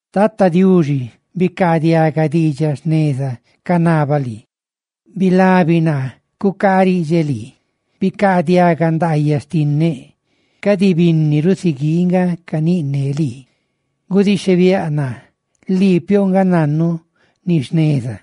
Tata Diuxi, bicaadiaga diidxaꞌ jneza canabaꞌ lii, bilabi naa cucaariꞌdxeꞌ lii, bicaadiaga ndaayaꞌ xtinneꞌ, cadi binni rusiguii nga caniꞌne lii. ¡Gudixhebiáꞌ naa, lii piouꞌ nga nannu ni jneza!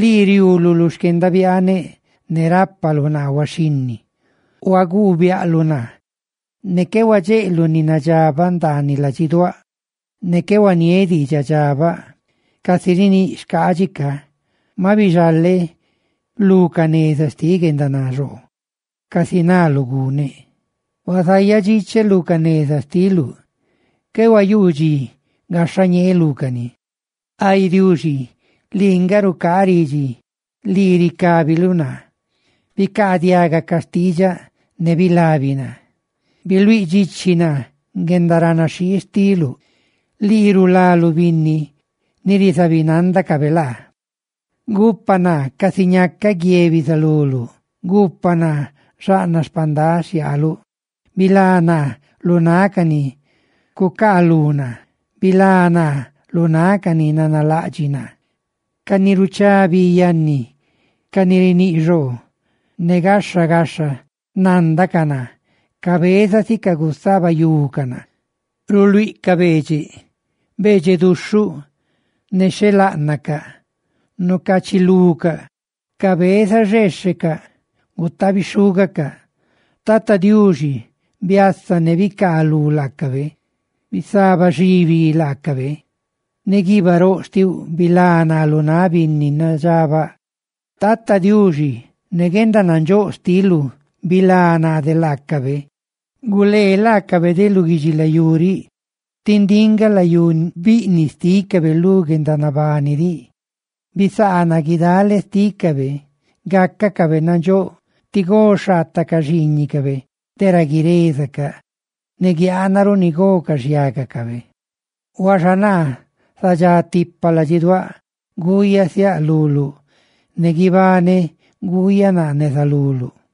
Lii riuuluꞌ lu xquendabiaaneꞌ; ne rápaluꞌ naa huaxhinni; huaguubiaꞌluꞌ naa, ne qué huadxeꞌluꞌ ni nadxabaꞌ ndaaniꞌ ladxiduáꞌ. Ne qué huaniéꞌ diidxaꞌdxabaꞌ, casi riníꞌ xcaadxi ca; maꞌ bixaleꞌ lu ca neza xtiꞌ guendanaxoo, casi naluꞌ guneꞌ. Huazayaꞌ dxiꞌcheꞌ lu ca neza xtiluꞌ; qué huayuu dxi gaxhañeeꞌ lúcani. Ay Diuxi, lii nga rucaa ridxi, lii ricábiluꞌ naa; bicaadiaga ca xtiidxaꞌ ne bilabi naa. Biluíꞌ dxichi naa guendaranaxhii xtiluꞌ, lii rulaluꞌ binni ni rizabinandacabe laa. Gupa naa casi ñacaꞌ guie bizaluluꞌ; gupa naa xaꞌnaꞌ xpandaꞌ xhiaaluꞌ, bilá naa lu náꞌ ca ni cucaalú naa, ¡bilá naa lu náꞌ ca ni nanalaꞌdxiꞌ naa! Ca ni ruchá bi yanni, ca ni riníꞌ xoo; ne gaxha gaxha nándacaꞌ naa, cabezasicaꞌ gusabayucaꞌ naa. Ruluíꞌcaꞌ beedxeꞌ, beedxeꞌ duxhuꞌ nexheláꞌnacaꞌ nucachilucaꞌ cabeza xeexhecaꞌ gutaabi xhúgacaꞌ. Tata Diuxi, ¡biasa ne bicaaluꞌ laacabe! ¡Bisabaxiibi laacabe! Ne guiibaꞌ roꞌ xtiuꞌ bilá naa lu náꞌ binni nadxabaꞌ; Tata Diuxi, ne guendanandxóꞌ xtiluꞌ bilá naa de laacabe; ¡gulee laacabe de lu guidxilayú riꞌ, tí ndiꞌ nga layú biꞌniꞌ xtícabe lu guendanabani diꞌ! Bisaana guidale xtícabe, gácacabe nandxóꞌ tí go xhaataꞌ ca xiiñiꞌcabe de ra guirezacaꞌ, ne guiaana ruꞌ ni go ca xhiágacabe. Huaxa naa, zadxá tipa ladxiduáꞌ, ¡guuyaꞌ siaꞌ luluꞌ, ne guibaneꞌ guuyaꞌ naa neza luluꞌ!